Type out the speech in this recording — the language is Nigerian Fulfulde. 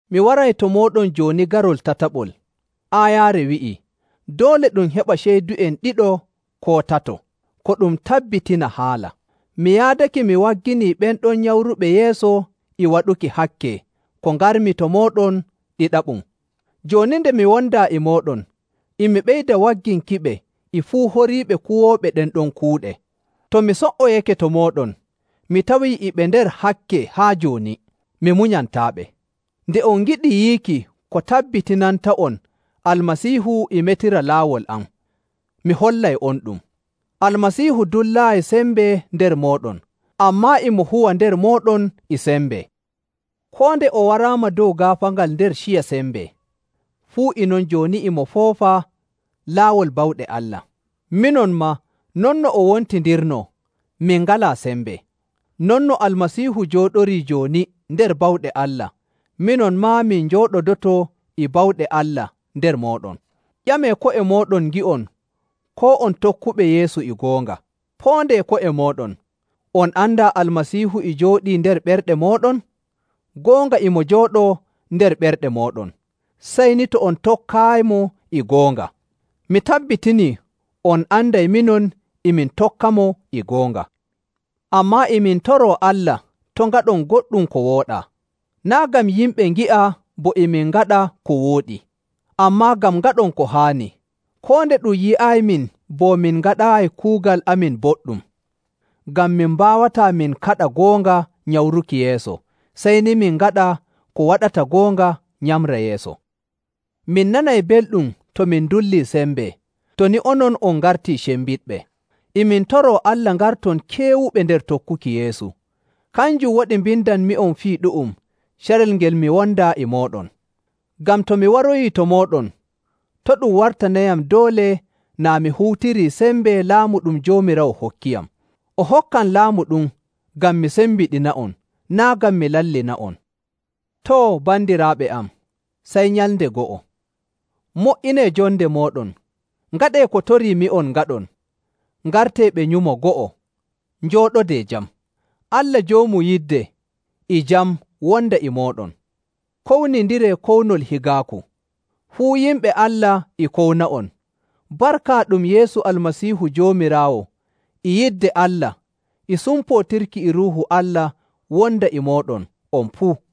Mi waray to mooɗon jooni garol tataɓol. Aayaare wi'ii, “Doole ɗum heɓa ceydu'en ɗiɗo koo tato ko ɗum tabbitina haala.” Mi yaadake mi wagginii ɓen ɗon nyamruɓe yeeso e waɗuki hakke ko ngarmi to mooɗon ɗiɗaɓum. Jooni nde mi wondaa e mooɗon, e mi ɓeyda wagginkiɓe e fuu horiiɓe kuwooɓe ɗen ɗon kuuɗe. To mi so''oyake to mooɗon, mi tawii e ɓe nder hakke haa jooni, mi munyantaaɓe. Nde on ngiɗi yiiki ko tabbitinanta'on Almasiihu e metira laawol am, mi hollay'onɗum. Almasiihu dullaayi sembe nder mooɗon, ammaa e mo huwa nder mooɗon e sembe. Koo nde o waraama dow gaafaangal nder ciya sembe, fuu e non jooni e mo foofa laawol bawɗe Allah. Minon maa non no o wontindirnoo, min ngalaa sembe. Non no Almasiihu jooɗorii jooni nder bawɗe Allah, minon maa min njooɗodoto e bawɗe Allah nder mooɗon. Ƴamee ko'e mooɗon ngi'on koo on tokkuɓe Yeesu e goonga. Poondee ko'e mooɗon. On andaa Almasiihu e jooɗi nder ɓerɗe mooɗon? Goonga e mo jooɗoo nder ɓerɗe mooɗon, sey ni to on tokkaayimo e goonga. Mi tabbitinii on anday minon e min tokkamo e goonga. Ammaa e min toroo Allah to' ngaɗon goɗɗum ko wooɗaa. Naa' ngam yimɓe ngi'a bo e min ngaɗa ko wooɗi, ammaa ngam ngaɗon ko haani, koo nde ɗum yi'aymin bo min ngaɗaayi kuugal amin boɗɗum. Ngam min mbaawataa min kaɗa goonga nyamruki yeeso, sey ni min ngaɗa ko waɗata goonga nyamra yeeso. Min nanay belɗum to min ndullii sembe, to ni onon on ngartii cembiɗɓe. E min toroo Allah ngarton keewuɓe nder tokkuki Yeesu. Kanjum waɗi mbindanmi'on fii ɗu'um carel ngel mi wondaa e mooɗon. Ngam to mi waroyii to mooɗon, to' ɗum wartanayam doole naa' mi huutirii sembe laamu ɗum Joomiraawo hokkiyam. O hokkam laamu ɗum ngam mi sembiɗina'on, naa' ngam mi lallina'on. Too, bandiraaɓe am, sey nyalnde go'o. Mo''inee jonde mooɗon, ngaɗee ko toriimi'on ngaɗon, ngartee ɓe nyumo go'o, njooɗodee jam. Allah joomu yidde e jam wonda e mooɗon. Kownindiree kownol higaaku. Fuu yimɓe Allah e kowna'on. Barka ɗum Yeesu Almasiihu Joomiraawo, e yidde Allah, e sumpootirki e Ruuhu Allah wonda e mooɗon on puu.